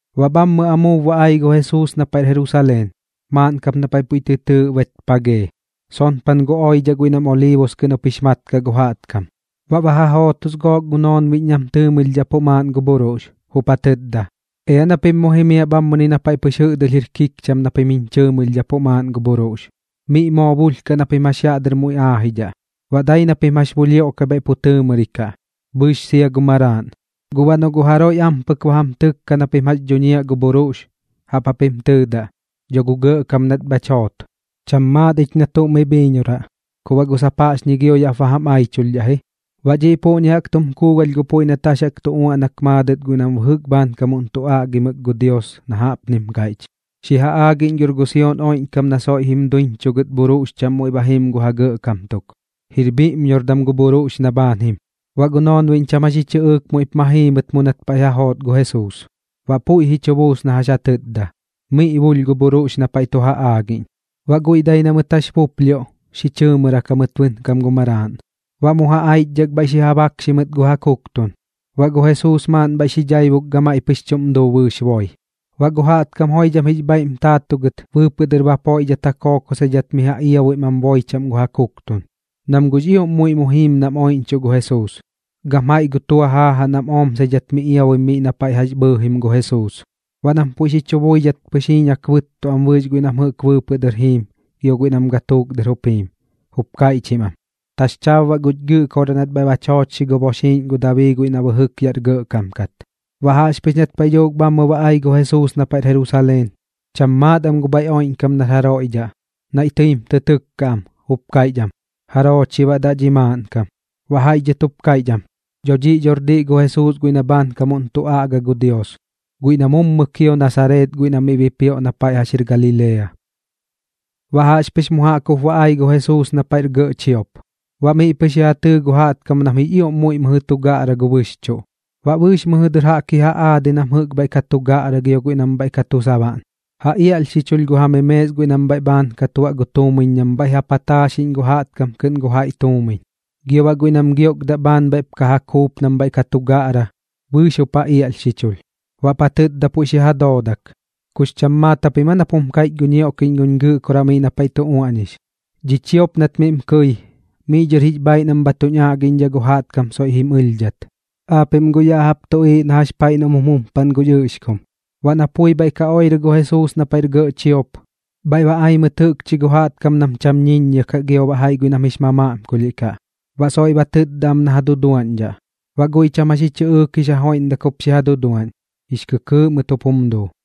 Baꞌ bhammɨ amuub ba ai gu Jesuus na paiꞌr Jerusaleen, maaꞌn kap na paiꞌ puiꞌ tɨ tɨɨꞌ Betpajee, sonpan gu oidhaꞌ guiꞌ nam Oliibus kɨꞌn jup jix mat kaꞌ gu jaꞌtkam. Baꞌ ba ja jootos gook gu noonbiꞌñ nam tɨɨmɨlhdhapuꞌ maaꞌn gu bhuruꞌx, jup ja tɨtda: ―Ea na pim mu jimiaꞌ bhammɨni na paiꞌ pɨx jɨꞌdɨlh jir kikcham na pim jiñ chɨɨmɨlhdhapuꞌ maaꞌn gu bhuruꞌx. Miꞌ moo bulhkaꞌ na pim jax yaꞌ dɨr mu aajidhaꞌ. Baꞌ dai na pim jax xi buplhioꞌkai bhaiꞌ pu tɨɨmɨrikaꞌ, bɨɨx sia gu maraaꞌn. Guꞌ baꞌ noꞌ guꞌ jaroiꞌ ampɨk ba jam tɨkka na pim jax dhuñiaꞌ gu bhuruꞌx, jaꞌp japim tɨɨdaꞌ: “Dho gu Gɇꞌkam nat bhach joot. Cham maat ich na tuꞌ mi bhiiñoraꞌ, ku baꞌ guꞌ sap jaꞌxñi gio yaꞌp bam aichulhdhaꞌ ji.” Baꞌ dhiꞌ puꞌñi jaꞌk tum kuugalh gu puiꞌ nat jax jaꞌk tu uaꞌnak maadɨt guiꞌ nam bɨjɨk bhaankam tu aꞌgimɨk gu Dios na jaꞌpnim kaiꞌch: Xi ja aagiꞌñ gor gu Sion oiꞌñkam na soiꞌ jim duiñchugɨt bhuruꞌx chaꞌm muiꞌ ba jim gu ja gɇꞌkam tuk. Jir bhiꞌññordam gu bhuruꞌx na bhaan jim. Baꞌ gu noonbiꞌñ cham jax ji chɨꞌɨɨk muiꞌp ma jii mɨt mu nat paiꞌ ja joot gu Jesuus. Baꞌ puiꞌ ji chu buus na jax ja tɨtda, miꞌ bulh gu bhuruꞌx na paiꞌ tu ja aagiꞌñ, baꞌ guiꞌ dai na mɨt jax buplhioꞌ xi chɨɨmɨrak jamɨt bɨnkam gu maraaꞌn. Baꞌ mu ja aichdhak bhaiꞌ xi ja bakxi mɨt gu ja kuktun, baꞌ gu Jesuus maaꞌn bhaiꞌ xi dhaibuk gamaiꞌ pɨx chuꞌm duu bɨɨx boi. Baꞌ gu jaꞌtkam joidham jix bhaiꞌ jim taatugɨt bɨɨpɨꞌ dɨr bapoiꞌdhat ja kookosidhat miꞌ ja iabuim am boi chaꞌm gu ja kuktun, nam guꞌx ioꞌm muiꞌ mu jiim nam oiꞌñchuꞌ gu Jesuus, gam jaiꞌ gu tua jaajaꞌ nam omsaidhat miꞌ iabuim miꞌ na paiꞌ jax bhɨɨjim gu Jesuus. Baꞌ nam puiꞌ xi chu buidhat pɨx jiiñak bɨttu am bɨɨx guiꞌ nam jɨꞌk bɨɨpɨꞌ dɨr jiim gio guiꞌ nam gatuuk dɨr jup jiim, jup kaiꞌchim am: ―¡Taxchaab baꞌ guch Gɨꞌkoraꞌ nat bhaiꞌ bach joochxi gu boxiiꞌñ gu Dabii guiꞌ na bɨjɨk yaꞌr gɇꞌkam kat! Baꞌ jaꞌxpɨx nat paiꞌ dhuuk bhammɨ ba ai gu Jesuus na paiꞌr Jerusaleen, cham maat am gu bhaiꞌ oiꞌñkam nar jaroiꞌ dhaꞌ. Naiꞌ tɨim tɨ tɨkka am, jup kaiꞌch am: ―¿Jaroo chi baꞌ daꞌ dhi maaꞌnkam? Baꞌ jaiꞌ dhɨt jup kaiꞌch am: ―Dho dhiꞌ dhor diꞌ gu Jesuus guiꞌ na bhaankamuꞌn tu aꞌga gu Dios, guiꞌ na mummɨ kio Nasareet guiꞌ na miꞌ bipioꞌ na paiꞌ jax jir Galilea. Baꞌ jaꞌxpɨx mu jaꞌk jup ba ai gu Jesuus na paiꞌr gɇꞌ chiop, baꞌ miꞌ pɨx ji ja tɨɨ gu jaꞌtkam nam jix ioꞌm muiꞌ mɨjɨ tu gaꞌra gu bɨxchuꞌ. Baꞌ bɨɨx miꞌ dhɨr jaꞌk ji ja aadi nam jɨꞌk bhaiꞌ ka tu gaꞌra gio guiꞌ nam bhaiꞌ ka tu sabaꞌn, ja iaꞌlhxichulh gu ja memees guiꞌ nam bhaiꞌ bhaan ka tuaꞌ gu tuumiñ nam bhaiꞌ ja pataaxiꞌñ gu jaꞌtkam kɨꞌn gu jaiꞌ tuumiñ, gio baꞌ guiꞌ nam giokdaꞌ bhaan bhaiꞌp ka ja kuup nam bhaiꞌ ka ja gaꞌra, bɨɨx jup ja iaꞌlhxichulh. Baꞌp ja tɨtda puiꞌ xi ja doodak: ―¿Kux cham maat japim aa nap jum kaiꞌch gu ñioꞌkiꞌñ guñ Gɨꞌkoraꞌ miꞌ na paiꞌ tu uaꞌñix: “Dhi chiop nat miꞌm kɨi, miꞌ dhɨr jix bhaaiꞌ nam bha tuñ aꞌgiꞌñdhaꞌ gu jaꞌtkam soiꞌ jim ɨlhdhat”? Aapiꞌm guꞌ ya jaꞌp tuꞌiiꞌ na jax paiꞌ noꞌm jum jumpaꞌn gu ɨꞌxkum. Baꞌ na pui bhaiꞌ ka oirɨ gu Jesuus na paiꞌr gɇꞌ chiop, bhaiꞌ ba ai mɨt jɨꞌkchi gu jaꞌtkam nam cham ñiññia kaꞌ gio baꞌ jaiꞌ guiꞌ nam jix mamaꞌmkulhiꞌ kaꞌ, baꞌ soiꞌ ba tɨtda am na ja duduaꞌñdhaꞌ. Baꞌ guiꞌ cham jax ji chɨꞌɨɨk jix ja joiꞌmdak jup xi ja duduaꞌñ, jix kɨkɨɨꞌ mɨt jup jum duu.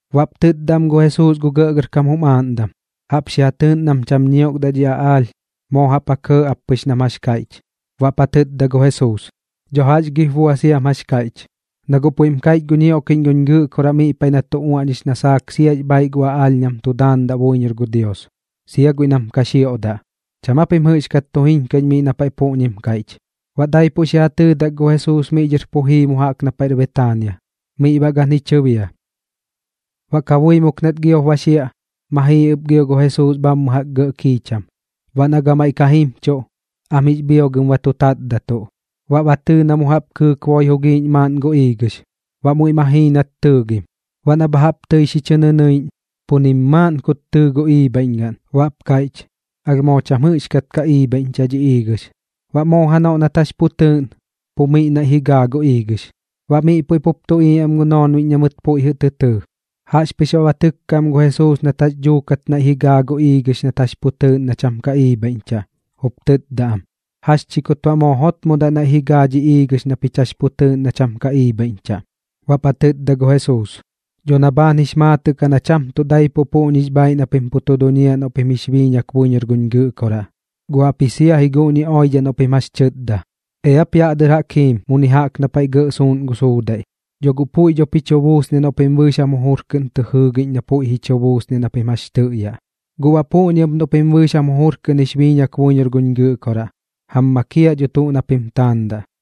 Baꞌp tɨtda am gu Jesuus gu gɇꞌgɇrkam jum aaꞌndam: ―Jaꞌp xi ja tɨɨꞌn nam cham ñiokdaꞌ dhi aꞌaalh. Moo jaꞌp ja kɇɇ ap pɨx nam jax kaiꞌch. Baꞌp ja tɨtda gu Jesuus: ―Dho jax gip bua siam jax kaiꞌch, na guꞌ puiꞌm kaiꞌch gu ñioꞌkiꞌñ guñ Gɨꞌkoraꞌ miꞌ na paiꞌ tu uaꞌñix na saak siax bhaaiꞌ gu aꞌaalh nam tu daandaꞌ buiñor gu Dios, sia guiꞌ nam ka xioꞌdaꞌ. ¿Cham aa pim jɨꞌxkat tu jiñkuiꞌñ miꞌ na paiꞌ puꞌñim kaiꞌch? Baꞌ daipuꞌ xi ja tɨɨdak gu Jesuus miꞌ dhɨr pu jii mu jaꞌk na paiꞌr Betaania, miꞌ baꞌ gan ji chɨbia. Baꞌ kabuimuk nat giop ba xiaꞌ, ma jii ɨp gio gu Jesuus bhammɨ jaꞌk gɇꞌ kiicham. Baꞌ na gamaiꞌ ka jimchuꞌ, am jix bhiogɨm ba tu tatdatuꞌ. Baꞌ ba tɨɨ na mu jaꞌp kɨɨk boi jugiiꞌñ maaꞌn gu iigɨx, baꞌ muiꞌ ma jii nat tɨɨgim. Baꞌ na bha jaꞌp tɨi xi ñɨnɨiꞌñ, pu nim maaꞌn kut tɨɨ gu iibhaiꞌñgaꞌn, baꞌp kaiꞌch: ―Alh moo cham jɨꞌxkat ka iibhaiꞌñchaꞌ dhi iigɨx. Baꞌ moo janoꞌ nat jax pu tɨɨꞌn, pu miꞌ naiꞌ ji gaa gu iigɨx. Baꞌ miꞌ puiꞌ pup tuꞌiiꞌ am gu noonbiꞌñ na mɨt puiꞌ jɨꞌ tɨ tɨɨ, jaꞌxpɨx baꞌ ba tɨkka am gu Jesuus nat jax dhuukat naiꞌ ji gaa gu iigɨx nat jax pu tɨɨꞌn na cham ka iibhaiꞌñchaꞌ, jup tɨtda am: ―¿Jax chi kut baꞌ moo jotmodaꞌ naiꞌ ji gaa dhi iigɨx na pich jax pu tɨɨꞌn na cham ka iibhaiꞌñchaꞌ? Baꞌp ja tɨtda gu Jesuus: ―Dho na bhaan jix maatɨꞌ kaꞌ na cham tuꞌ daipuꞌ puꞌñix bhaaiꞌ na pim pu tu duñiaꞌ noꞌ pim jix biiñak buiñor guñ Gɨꞌkoraꞌ, guꞌ jaꞌpji sia ji guꞌñi oidhaꞌ noꞌ pim jax tɨtda: “Eap yaꞌ dɨr jaꞌk jim muni jaꞌk na paiꞌ gɇꞌ suuꞌn gu suudaiꞌ”, dho guꞌ puiꞌ dho ji chu buusniaꞌ noꞌ pim bɨɨx jam jujur kɨꞌn tɨ jɨɨgiꞌñ na puiꞌ ji chu buusniaꞌ na pim jax tɨꞌyaꞌ. Guꞌ baꞌ puꞌñi ɨp noꞌ pim bɨɨx jam jujur kɨꞌn jix biiñak buiñor guñ Gɨꞌkoraꞌ, jam makiaꞌ dho tuꞌ na pim taandaꞌ.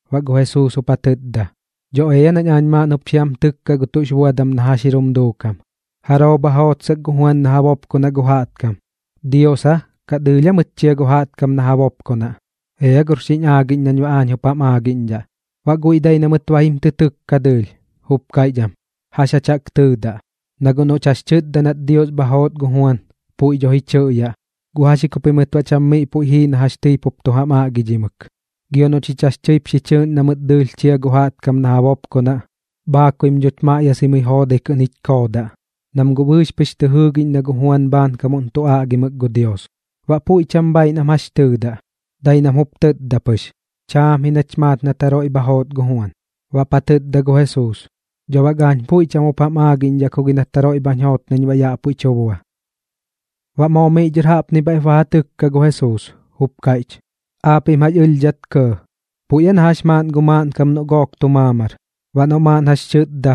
Baꞌ gu Jesuus jup ja tɨtda: ―Dho ea nañ aañ maaꞌn jup xi jam tɨkkaꞌ gu tuꞌx buadam na jax jir jum duukam. ¿Jaroo bha joot saak gu Juan na ja bopkonaꞌ gu jaꞌtkam? ¿Dios aa, kaꞌ dɨɨlh aa mɨt chia gu jaꞌtkam na ja bopkonaꞌ? Ea gor xiñ aagiꞌñ nañ baꞌ aañ jup jam aagiꞌñdhaꞌ. Baꞌ guiꞌ dai na mɨt ba jim tɨ tɨkka dɨɨlh, jup kaiꞌch am: ―¿Jax jach jaꞌk tɨɨdaꞌ? Na guꞌ noꞌch jax kaiꞌch nat gu Dios bha joot gu Juan, puiꞌ dho ji chɨꞌyaꞌ: “¿Guꞌ jax ji ku pimɨt baꞌ cham miꞌ puiꞌ jii na jax tɨi pup tu jam aꞌgidhimɨk?” Gio noꞌ chich jax tɨip xi chɨɨꞌn na mɨt dɨɨlh chia gu jaꞌtkam na ja bopkonaꞌ, bhaakuim dhoch maꞌyasai joodai kɨꞌn jich koodaꞌ, nam guꞌ bɨɨx pɨx tɨ jɨɨgiꞌñ na gu Juan bhaankam tu aꞌgimɨk gu Dios. Baꞌ puiꞌ cham bhaaiꞌ nam jax tɨɨdaꞌ, dai nam jup tɨtda pɨx: ―Chaam ji nach maat nat jaroiꞌ bha joot gu Juan. Baꞌp ja tɨtda gu Jesuus: ―Dho bak aañ puiꞌ cham jup jam aagiꞌñdhaꞌ ku gi nat jaroiꞌ bhañ joot nañ baꞌ yaꞌ puiꞌ tu bua. Baꞌ moo miꞌ dhɨr jaꞌpni bhaiꞌp ba ja tɨkka gu Jesuus, jup kaiꞌch: ―¿Aapiꞌm jax ɨlhdhat kɇɇ? Puiꞌ na jax maaꞌn gu maaꞌnkam noꞌ gook tu maamar, baꞌ noꞌ maaꞌn jax tɨtda: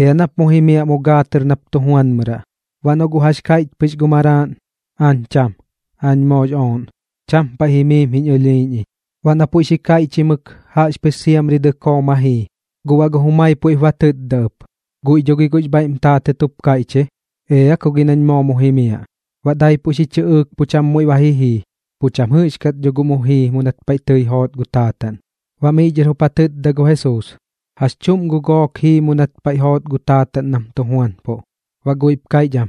“Ea nap mu jimiaꞌ mu gaa tɨr nap tu juanmɨraꞌ.” Baꞌ noꞌ guꞌ jax kaiꞌch pɨx gu maraaꞌn: “Aañ cham. Aañ moox ooꞌn. Cham paiꞌ jimiim jiñ ɨlhiiꞌñ iñ.” Baꞌ na puiꞌ xi kaiꞌchimɨk jaꞌxpɨx siamri dɨkoo ma jii. Guꞌ baꞌ gu jumai puiꞌp ba tɨtda ɨp, guiꞌ dho gi guꞌx bhaiꞌm taatɨt jup kaiꞌch ji: “Ea ku gi nañ moo mu jimiaꞌ.” Baꞌ daipuꞌ xi chɨꞌɨɨk pu cham muiꞌ ba ji jii, pu cham jɨꞌxkat dho guꞌ mu jii mu nat paiꞌ joot gu taataꞌn. Baꞌ miꞌ dhɨr jup ja tɨtda gu Jesuus: ―¿Jax chuꞌm gu gook jii mu nat paiꞌ joot gu taataꞌn nam tu juanpuꞌ? Baꞌ guiꞌp kaiꞌch am: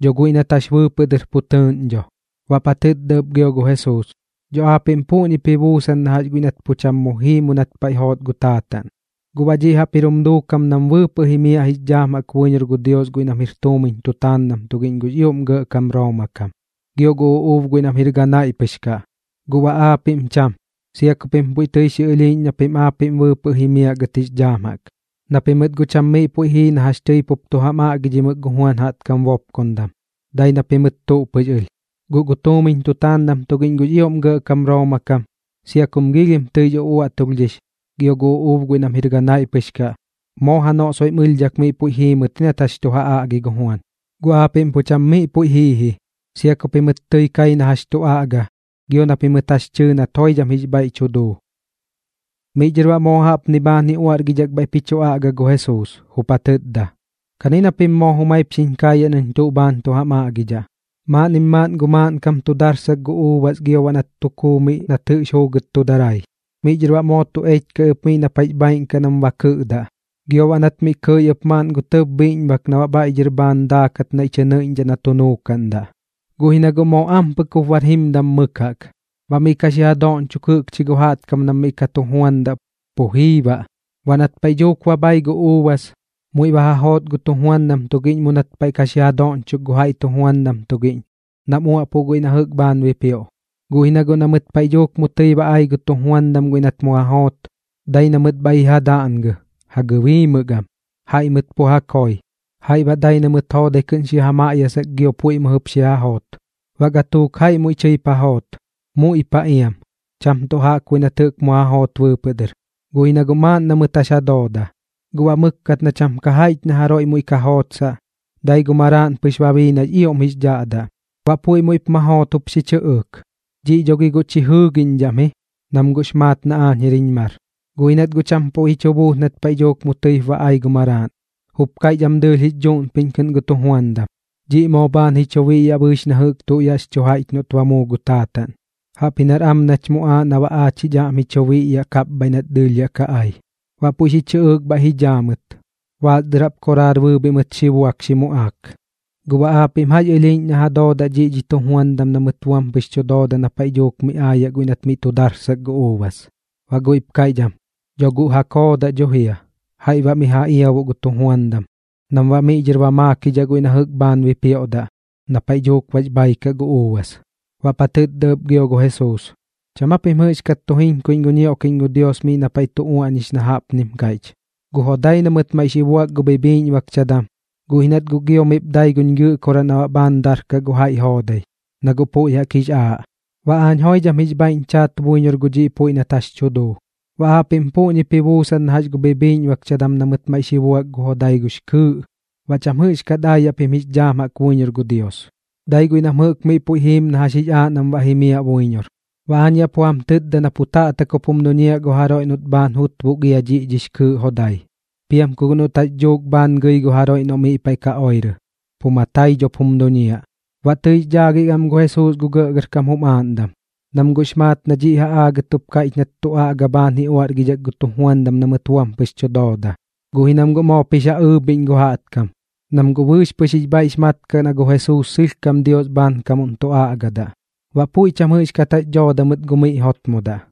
―Dho guiꞌ nat jax bɨɨpɨꞌ dɨr pu tɨɨꞌn dho. Baꞌp ja tɨtda ɨp gio gu Jesuus: ―Dho aapiꞌm puꞌñip ji buusan na jax guiꞌ nat pu cham jii mu nat paiꞌ joot gu taataꞌn. Guꞌ baꞌ dhiꞌ jaꞌp jir jum duukam nam bɨɨpɨꞌ jimiaꞌ jix dhaam jaꞌk buiñor gu Dios guiꞌ nam jir tuumiñ tutaandam tugiꞌñ gux ioꞌm gɇꞌkam Rooma kam, gio gu uꞌuub guiꞌ nam jir ganaiꞌ pɨx kaꞌ. Guꞌ baꞌ aapiꞌm cham, sia ku pim puiꞌ tɨi xi ɨlhiiꞌñ na pim aapiꞌm bɨɨpɨꞌ jimiaꞌ gɨt jix dhaam jaꞌk, na pimɨt guꞌ cham miꞌ puiꞌ jii na jax tɨi pup tu jam aꞌgidhimɨk gu Juan jaꞌtkam bopkondam, dai na pimɨt tuꞌ pɨx ɨlh. Guꞌ gu tuumiñ tutaandam tugiꞌñ gux ioꞌm gɇꞌkam Rooma kam, sia kum giilhim tɨix uꞌuaꞌtulhdhix, gio gu uꞌuub guiꞌ nam jir ganaiꞌ pɨx kaꞌ, moo janoꞌ soiꞌ jim ɨlhdhak miꞌ puiꞌ jii mɨt nat jax tu ja aꞌgi gu Juan. Guꞌ aapiꞌm pu cham miꞌ puiꞌ jii ji, sia ku pimɨt tɨi kai nat jax tu aꞌga gio na pimɨt jax tɨɨ nat joidham jix bhaiꞌ tu duu. Miꞌ dhɨr baꞌ moo jaꞌpni bhaan ji uaꞌrgidhak bhaiꞌp ji chu aꞌga gu Jesuus, jup ja tɨtda: ―Kani na pim moo jumaip xiñ kaayaꞌ nañ tuꞌ bhaan jup tu jam aꞌgidhaꞌ. Maaꞌnnim maaꞌn gu maaꞌnkam tu darsak gu uubas gio baꞌ nat tu kuu miꞌ nat jɨꞌx juugɨt tu darai. Miꞌ dhɨr baꞌ moo tu echkai ɨp miꞌ na paiꞌx bhaiꞌn kaꞌ nam ba kɨiꞌdaꞌ, gio baꞌ nat miꞌ kɨi ɨp maaꞌn gu tɇb bhiꞌñbak na baꞌ bhaiꞌ dhɨr bhaan daakat naiꞌ tɨ nɨiꞌñdhaꞌ na tu nuukaꞌndaꞌ. ’Guꞌ ji na guꞌ moo ampɨk jup bar jimdam mɨk jaꞌk. Baꞌ miꞌ ka xi ja doꞌñchok jɨꞌkchi gu jaꞌtkam nam miꞌ ka tu juandaꞌ pu jii baꞌ. Baꞌ nat paiꞌ dhuuk ba bhai gu uubas, muiꞌ ba ja joot gu tujuandam tugiꞌñ mu nat paiꞌ ka xi ja doꞌñchok gu jaiꞌ tujuandam tugiꞌñ nam uaꞌpuꞌ guiꞌ na jɨꞌk bhaan bipioꞌ. Guꞌ ji na guꞌ na mɨt paiꞌ dhuuk tɨi mu ba ai gu tujuandam guiꞌ nat mu ja joot, dai na mɨt bhaiꞌ ji ja daꞌngɨ, ja gɨbiimɨk am, jaiꞌ mɨt pu ja koi, jaiꞌ baꞌ dai na mɨt joodai kɨꞌn xi ja maꞌyasak gio puiꞌ mɨjɨp xi ja joot. Baꞌ gatuuk jaiꞌ muiꞌ tɨip ja joot, muiꞌ paꞌ iam, cham tuꞌ jaꞌkbuiꞌ nat jɨꞌk mu ja joot bɨɨpɨꞌ dɨr, guꞌ ji na guꞌ maaꞌn na mɨt jax ja dooda. ’Guꞌ baꞌ mɨkkat na cham ka jaiꞌch na jaroiꞌ muiꞌ ka jootsaꞌ, dai gu maraaꞌn pɨx ba bii guiꞌ nax ioꞌm jix dhaꞌdaꞌ. Baꞌ puiꞌ muiꞌp ma joot jup xi chɨꞌɨɨk: “Dhiꞌ dho gi guꞌ chi jɨɨgiꞌñdhaꞌ am ji, nam guꞌx maat na aañ jir jiñ mar.” Guꞌ ji nat guꞌ cham puiꞌ ji chu buus nat paiꞌ dhuuk mu tɨip ba ai gu maraaꞌn. Jup kaiꞌch am dɨɨlh jix dhuꞌnpiꞌñ kɨꞌn gu tujuandam: “Dhiꞌ moo bhaan ji chu biꞌyaꞌ bɨɨx na jɨꞌk tuꞌ yaꞌx chu jaiꞌch noꞌt ba muu gu taataꞌn. Jaꞌpji nar am ji nach muꞌaaꞌ na baꞌ aach jich aꞌm ji chu biꞌyaꞌ kapbhaiꞌ nat dɨɨlh yaꞌ ka ai.” Baꞌ puiꞌ xi chɨꞌɨɨk bhaiꞌ ji dhaa mɨt, baas dɨr jaꞌp koraar bɨɨbhiꞌ mɨt xi baidhak xi muꞌaak. ’¿Guꞌ baꞌ aapiꞌm jax ɨlhiiꞌñ na ja doodaꞌ dhiꞌ dhi tujuandam na mɨt buam pɨx tu dooda na paiꞌ dhuuk miꞌ aayaꞌ guiꞌ nat miꞌ tu darsak gu uubas? Baꞌ guiꞌp kaiꞌch am: ―Dho guꞌ ja koodaꞌ dho jia, jaiꞌ baꞌ miꞌ ja iabuꞌ gu tujuandam, nam baꞌ miꞌ dhɨr ba maakidhaꞌ guiꞌ na jɨꞌk bhaan bipioꞌdaꞌ na paiꞌ dhuuk bax bhai kaꞌ gu uubas. Baꞌp ja tɨtda ɨp gio gu Jesuus: ―¿Cham aa pim jɨꞌxkat tu jiñkuiꞌñ gu ñioꞌkiꞌñ gu Dios miꞌ na paiꞌ tu uaꞌñix na jaꞌpnim kaiꞌch: Gu jodai na mɨt maiꞌ xi buak gu bhibhiꞌñbakchadam, guꞌ ji nat guꞌ gio miꞌp dai guch Gɨꞌkoraꞌ na baꞌ bhaan darkaꞌ gu jaiꞌ joodai, na guꞌ puiꞌ jaꞌk jix aaꞌ, baꞌ aañ joidham jix bhaiꞌñ chaat buiñor gu dhiꞌ puiꞌ nat jax tu duu? Baꞌ aapiꞌm puꞌñip ji buusan na jax gu bhibhiꞌñbakchadam na mɨt maiꞌ xi buak gu jodai gux kɨɨꞌ, baꞌ cham jɨꞌxkat aayaꞌ pim jix dhaam jaꞌk buiñor gu Dios. Dai guiꞌ nam jɨꞌk miꞌ puiꞌ jiim na jax jix aaꞌ nam baꞌ jimiaꞌ buiñor. Baꞌ aañ yaꞌ pu jam tɨtda na pu taꞌtak jup jum duñiaꞌ gu jaroiꞌ noꞌt bhaan jutbuk ia dhiꞌ dhix kɨɨꞌ jodai. Piam ku guꞌ noꞌt jax dhuukat bhaan gɨi gu jaroiꞌ noꞌ miꞌ paiꞌ ka oirɨ, pu matai dhop jum duñiaꞌ. Baꞌ tɨix dhaagik am gu Jesuus gu gɇꞌgɇrkam jum aaꞌndam, nam guꞌx maat na dhiꞌ ja aagɨt jup kaiꞌch nat tu aꞌga bhaan ji uaꞌrgidhak gu tujuandam na mɨt buam pɨx tu dooda. Guꞌ ji nam guꞌ moop jix ja ɨɨbhiꞌñ gu jaꞌtkam, nam guꞌ bɨɨx pɨx jix bhaiꞌx mat kaꞌ na gu Jesuus sɨlhkam Dios bhaankamuꞌn tu aꞌgadaꞌ. Baꞌ puiꞌ cham jɨꞌxkat jax dhooda mɨt gu miꞌ jotmodaꞌ.